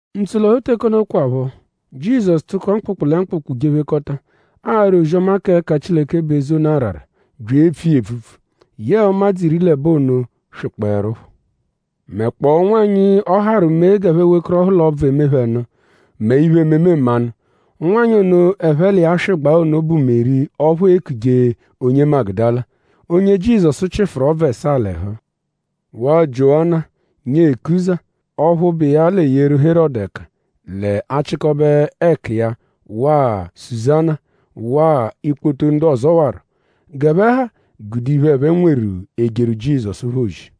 Ntsolọhu teke ono kwaphọ; Jizọsu tụko mkpụkpu lẹ mkpụkpu jephekọta; ara ozi-ọma k'ẹka Chileke bụ eze ono arara; bya epfu iya epfupfu. Yẹe ụmadzu iri l'ẹbo ono swịkpoerupho; mẹkpoo ụnwanyi, ọ harụ mee g'ẹphe wekọrohu l'ọbvu, eme phẹ nụ; mẹ iphe-ememe mmanụ. Ụnwanyi ono, ẹphe l'iya swịgbaa ono bụ Meri ọphu eekuje onye Magudala; onye Jizọsu chịfuru ọbvu ẹsaa l'ẹhu; waa Jiowana, nyee Kuza ọphu bụ iya l'eyeru Herọdu ẹka l'achịkobe ẹku iya waa Suzana; waa ikpoto ndu ọzowaro. G'ẹphe ha gude iphe, ẹphe nweru ejeru Jizọsu phẹ ozi.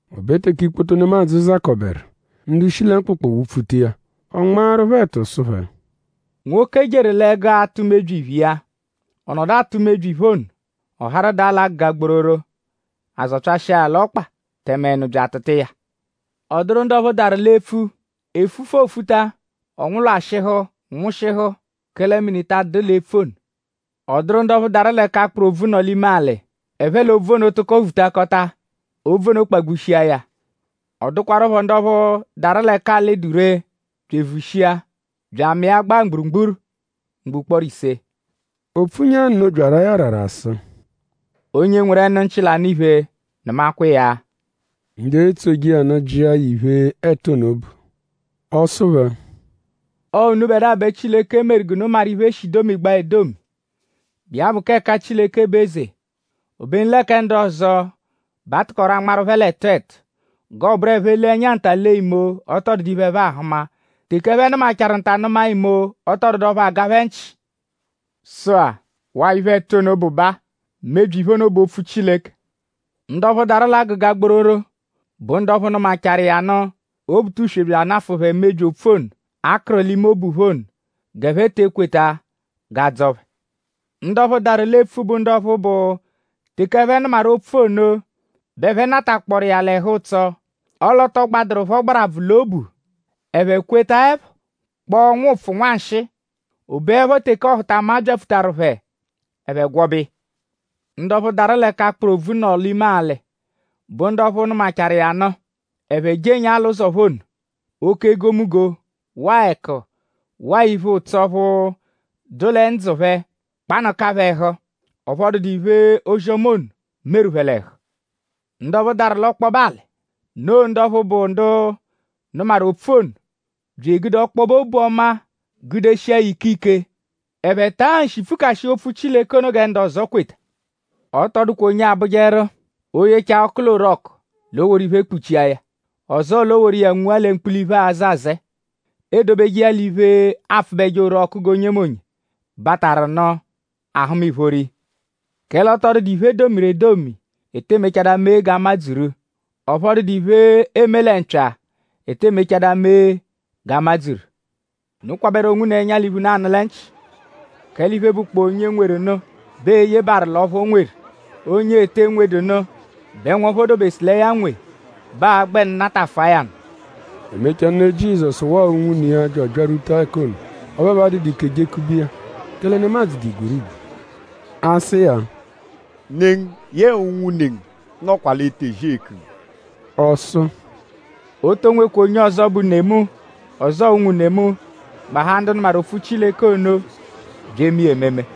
O be teke ikpoto nemadzụ zakọberu; ndu shi lẹ mkpụkpu wụ-pfuta iya; ọ nmaaru phẹ ẹtu sụ phẹ: “Nwoke jeru l'ẹgu atụ mebyi iphe iya. Ọ nọdu atụ mebyi iphe ono; ọ harụ daa l'agụga gbororo; a zọpyashia ya l'ọkpa tẹme ẹnu bya atụtua ya. Ọ dụru ndu ọphu daru l'epfu; efufu, oofuta ọ nwụlwashihu nwụshihu; kẹle mini ta adụdu l'epfu ono. Ọ dụru ndu ọphu daru l'ẹka akpụru obvu nọ l'ime alị; ẹphe l'obvu ono tụko vutakọta. Ọbvu ono kpagbushia ya. Ọ dụkwarupho ndu ọphu daru l'ẹka alị dụ ree bya evushia; bya amịa gbaa mgburugburu ugbo ụkporo ise.” O pfunya nno bya ara ya arara sụ: “Onye nweru ẹnu-nchị, l'anụ iphe; nụmakwa iya!” Ndu etsoje iya nụ jịa ya iphe, ẹtu ono bụ. Ọ sụ phẹ: “Ọo unubẹdua bẹ Chileke meru g'unu maru iphe, e shi domigbaa edomi, bụ iya bụ k'ẹka Chileke bụ eze; obenu lẹ kẹ ndu ọzo bẹ a tụkoru anmarụ phẹ l'ẹtu ẹtu; g'ọoburu ẹphe -lee ẹnya nta lee imo; ọ tọ dụdu iphe, ẹphe ahụma; teke ẹphe nụmachaaru nta nụma imo; ọ tọ dụdu ọphu aga phẹ nchị.” Sụ-a; waa iphe, ẹtu ono bụ baa: “Mebyi iphe ono bụ opfu Chileke. Ndu ọphu daru l'agụga gbororo bụ ndu ọphu nụmachaaru iya nụ; Obutuswe bya anafụ phẹ mebyi opfu ono, a kụru l'ime obu phẹ ono; g'ẹphe te ekweta g'a dzọo phẹ. Ndu ọphu daru l'epfu bụ ndu ọphu bụ teke ẹphe nụmaru opfu ono bẹ ẹphe natakpọoru iya l'ẹhu-ụtso; ọle ọ tọ gbadụru phẹ ọgbarabvu l'obu; ẹphe kwetaẹpho; kpọo nwụpfu nwanshịi; o beẹpho teke ọhutama byapfutaru phẹ; ẹphe gwọbe iya. Ndu ọphu daru l'ẹka akpụru obvu nọ l'ime alị bụ ndu ọphu nụmachaaru iya nụ; ẹphe jenyaa l'ụzo phẹ ono; oke egomunggo; waa ẹku; waa iphe-ụtso ọphu dụ lẹ ndzụ phẹ kpanụka phẹ ẹhu; ọphu ọ dụdu iphe, ozi-ọma ono meru phẹ l'ẹhu. Ndu ọphu daru l'ọkpobe alị; noo ndu ọphu bụ ndu nụmaru opfu ono bya egude ọkpobe obu ọma gudeshia ya ike-ike. Ẹphe taa nshi pfukashịa opfu Chileke ono gẹ ndu ọzo kweta.” “Ọ tọ dụkwa onye abụjeru; o -yechaa ọku l'orọku l'o woru iphe kpuchia ya; ọzoo l'o woru iya nwua lẹ mkpula iphe, aazẹ azẹe. Eedobeje iya l'iphe, aapfụbeje orọku g'onyemonye, bataru nụ a-hụma ìphóró iya. Kẹle ọ tọ dụdu iphe, e domiru edomi, e tee mechadaa mee g'a madzuru; ọphu ọ dụdu iphe, eeme lẹ mpya, e tee mechadaa mee g'a madzuru. “Unu kwabẹru onwunu ẹnya l'iphe, unu anụ lẹ nchị; kẹle iphe, bụkpoo onye nweru nụ bẹ ee-yebaaru l'ọphu o nweru. Onye ete nwedu nụ bẹ nwọphu o dobesụ lẹ ya nweru bẹ aa-gbẹnu natafụa ya nụ.” E mechaa; ne Jizọsu waa unwune iya bya abyarwuta ẹka ono. Ọphu ẹphe adụdu ike jekube iya; kẹle nemadzụ dụ igwerigwe. A sụ iya: “Ne ngu yẹe unwune ngu nọkwa l'etezi eku ngu.” Ọ sụ: “O to nwekwa onye ọzo, bụ ne mu; ọzoo unwune mu; gbahaa ndu nụmaru opfu Chileke ono bya eme iya ememe.”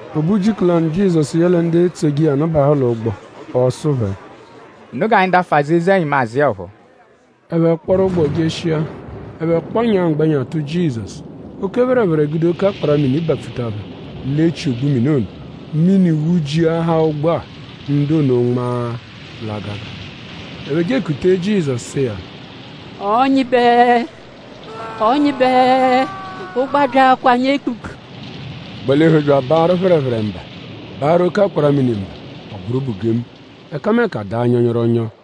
O be ujiku lanụ; Jizọsu yẹle ndu etsoje iya nụ bahụ l'ụgbo. Ọ sụ phẹ: “Unu g'anyi dafụ azụ eze-ẹnyimu azụ iya ọphuu.” Ẹphe kpọru ụgbo jeshia. Ẹphe kpọnyaa; mgbẹnya tụ Jizọsu. Oke phẹrephere gude oke akpara-mini bapfuta phẹ l'echi ogbu mini ono. Mini wụjiahaa ụgbo-a; ndu ono nma l'agaga. Ẹphe je ekutee Jizọsu sụ iya: “Ọnyibe! Ọnyibe! Ụgbo abyaakwaa anyi ekpukpu!” Ọ gbalihu bya abaarụ phẹrephere mba; baarụ oke akpara-mini mba; ọ bụru bugemu. Ẹkameka daa nyọnyoronyo.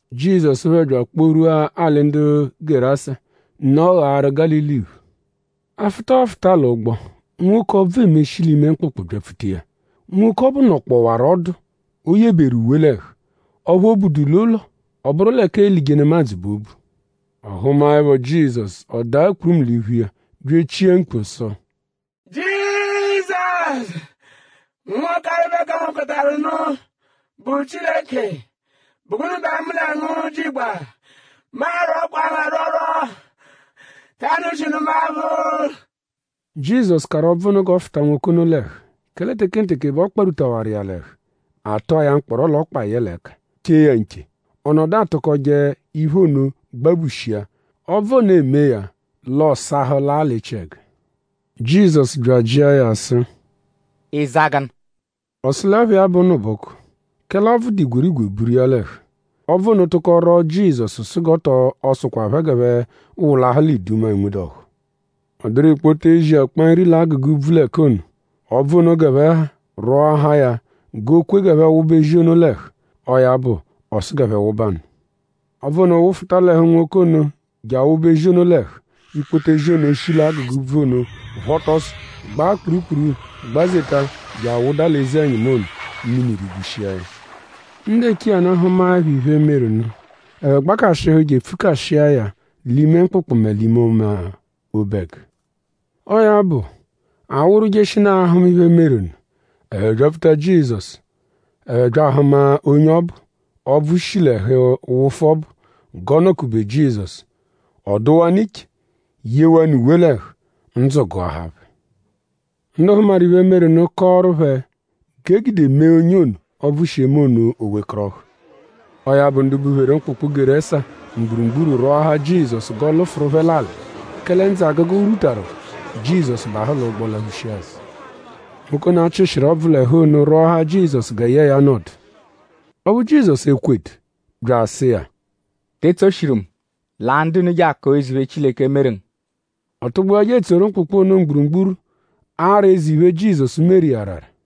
Jizọsu phẹ bya akpọ-rwua alị ndu Gerasa, nọ ghaaru Gálili iphu. Afụta, ọofuta l'ụgbo; nwoke, ọbvu eme, shi l'ime mkpụkpu gbapfuta iya. Nwoke ọbu nọkpowaru ọdu o yeberu uwe l'ẹhu; ọphu o budu l'ụlo; ọ bụru l'ẹka eelije nemadzụ bẹ o bu. Ọ hụmaepho Jizọsu; ọ daa kpurumu l'iphu iya; bya echia mkpu sụ: “Jizọsu! Nwa Ọkalibe-kangokọtaru-nụ, bụ Chileke!?Bụ gụnu bẹ mu lẹ ngu jigba? Mu arwọkwa ngu arwọrwo; ta anụshinu mu aphụ.” Jizọsu kahawarụ ọbvu ono g'ọ fụta nwoke ono l'ẹhu; kẹle tekenteke bẹ ọ kparwutawaru iya l'ẹhu. A tụa ya mkpọro l'ọkpa yẹle ẹka; chee ya nche. Ọ nọdu atụkoje iphe ono gbabushia; ọbvu ono emee ya; l'ọ sahụ laa l'echiẹgu. Jizọsu bya ajịa ya sụ: “?Ịiza gụnu?” Ọ sụ l'ẹpha iya bụ Ụnubuku; kẹle ọbvu dụ igwerigwe buru iya l'ẹhu. Ọbvu ono tụko rwọo Jizọsu sụ g'ọ tọ sụkwa phẹ g'ẹphe wụlahu l'iduma, enwedu ọ́hú. Ọ dụru ikpoto ezi, akpa nri l'agụga úbvú l'ẹka ono. Ọbvu ono g'ẹphe ha rwọahaa ya g'o kwe g'ẹphe wụba ezi ono l'ẹhu. Ọo ya bụ; ọ sụ g'ẹphe wụbanu. Ọbvu ono wụfuta l'ẹhu nwoke ono je awụba ezi ono l'ẹhu. Ikpoto ezi ono shi l'agụga úbvú ono phọta ọso; gbaa kpurukpuru gbazeta je awụda l'eze-ẹnyimu ono; mini rigbushia ya. Ndu eche iya nụ hụmaepho iphe, meru nụ; ẹphe gbakashịhu je epfukashia ya l'ime mkpụkpu mẹ l'ọma obẹgu. Ọo ya bụ; a wụru jeshinaa ahụma iphe, meru nụ. Ẹphe byapfuta Jizọsu; ẹphe bya ahụma onye ọbu, ọbvu shi l'ẹhu wụfu ọbu g'ọ nọ-kube Jizọsu. Ọ dụwanu iche; yewanụ uwe l'ẹhu; ndzụ gụahaa phẹ. Ndu hụmaru iphe, meru nụ kọoru phẹ g'e gude mee onye ono, ọbvu shi eme ono o wekọrohu. Ọo ya bụ; ndu bupheru mkpụkpu Gerasa mgburugburu rwọahaa Jizọsu g'ọ lụfuru phẹ l'alị; kẹle ndzụ-agụgu rwutaru phẹ. Jizọsu bahụ l'ụgbo laphushia azụ. Nwoke ono, a chịshiru ọbvu l'ẹhu ono rwọahaa Jizọsu gẹ yẹe ya nọdu. Ọphu Jizọsu ekwedu; bya asụ iya: “Te etsoshiru mu. Laa ndu unu je akọo eze iphe, Chileke meru ngu.” Ọ tụgbua je etsoru mkpụkpu ono mgburugburu ara eze iphe, Jizọsu meru iya arara.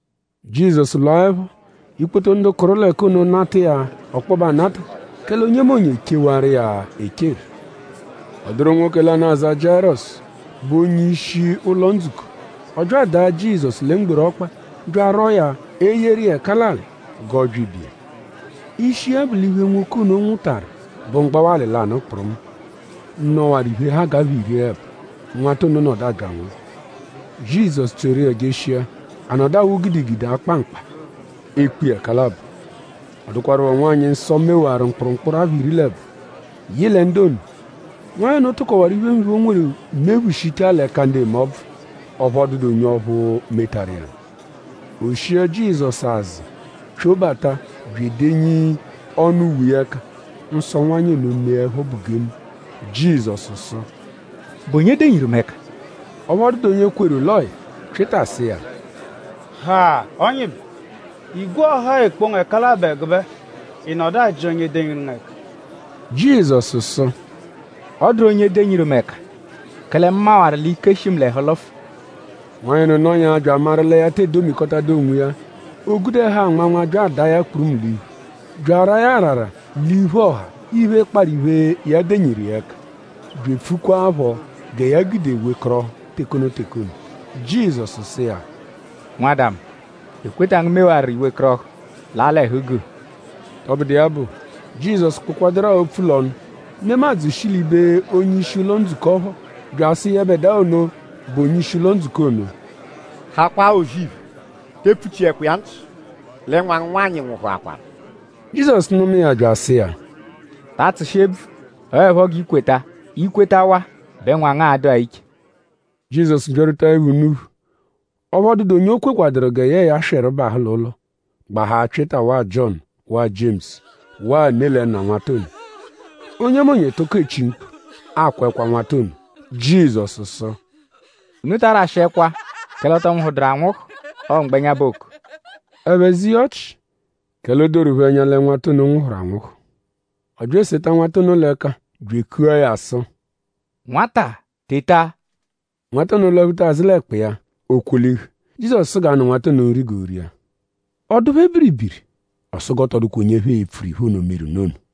Jizọsu lwaẹpho; ikpoto ndu kụru l'ẹka ono nata iya ọkpobe anata; kẹle onyemonye echewaru iya echeru. Ọ dụru nwoke lanụ, aza Jiayirọsu, bụ onye-ishi ụlo-ndzukọ. Ọ bya adaa Jizọsu lẹ mgboru ọkpa; bya arwọ iya; eyeru iya ẹka l'alị g'ọ bya ibe iya. Ishi iya bụ l'iphe, nwoke ono nwụtaru bụ mgbawalị lanụ kpụrumu, nọwaru iphe, ha g'apha iri l'ẹbo. Nwata ono nọdu abya anwụhu. Jizọsu tsoru iya jeshia. A nọdu awụ gidigidi akpa mkpa; ekpo iya ẹka labọ. Ọ dụkwarupho nwanyị, nsọ-nwanyị mewaru mkpụrumkpuru apha iri l'ẹbo, yị lẹ ndu ono. Nwanyị ono tụkowaru iphemiphe, o nweru mephushichaa l'ẹka ndu eme ọbvu; ọphu ọ dụdu onye ọphu metaru iya nụ. O shia Jizọsu azụ pyobata bya edenyi ọnu uwe iya ẹka; nsọ nwanyị ono meẹpho bugengu. Jizọsu sụ: “?Bụ onye denyiru mu ẹka?” Ọphu ọ dụdu onye kweru l'ọo ya. Pyịta sụ iya: “Ha! Ọnyibe; igwe ọha-a ekpo ngu ẹka labọ ẹgube-a; ị nọdu ajị onye denyiru ngu ẹka.” Jizọsu sụ: “Ọ dụru onye denyiru mu ẹka; kẹle mu mawaru l'ike shi mu l'ẹhu lụfu.” Nwanyị ono nọnyaa bya amaru lẹ ya tee domikọtadu onwiya; o gude ẹhu anmanma bya adaa ya kpurumu l'iphu; bya araa ya arara l'iphu ọha iphe, kparụ iphe, ya denyiru iya ẹka; bya epfukwaaphọ gẹ ya gude wekọrohu teke ono teke ono. Jizọsu sụ iya: “Nwada mu; ekweta ngu mewaru i wekọrohu. Laa l'ẹhu-guu!” Tọbudu iya bụ; Jizọsu kpụkwaduru-a opfu l'ọnu; nemadzụ shi l'ibe onye-ishi ụlo-ndzukọ phọ bya asụ yẹbedua ono, bụ onye-ishi ụlo-ndzukọ ono: “Hakwaa O-zì-iphe; te epfuchiẹkwa iya nchị; lẹ nwa ngu nwanyị nwụhuakwaru.” Jizọsu nụma iya bya asụ iya: “Ta atsụshi ebvu! Ọo 'ẹpho g'i kweta! I -kwetawaa bẹ nwa ngu a-dụa iche.” Jizọsu byarwutaẹpho unuphu; ọphu ọ dụdu onye o kwekwaduru gẹ yẹe ya swịru bahụ l'ụlo; gbahaa Pyịta; waa Jiọnu; waa Jiemusu; waa ne lẹ nna nwata ono. Onyemonye tụko echi mkpu; akwa ẹkwa nwata ono. Jizọsu sụ: “Unu ta arashị ẹkwa; kẹle ọ tọ nwụhuduru anwụhu. Ọo mgbẹnya bẹ ooku.” Ẹphe ze iya ọchi; kẹle o doru phẹ ẹnya lẹ nwata ono nwụhuru anwụhu. Ọ bya eseta nwata ono l'ẹka bya ekua ya sụ: “Nwata! Teta!” Nwata ono lwaphuta azụ l'ẹkpa iya. O kwolihu. Jizọsu sụ g'a nụ nwata ono nri g'o ria. Ọ dụ ndibe phẹ biribiri. Ọ sụ g'ọ tọ dụkwa onye ẹphe e-pfuru iphe ono, meru nụ ono.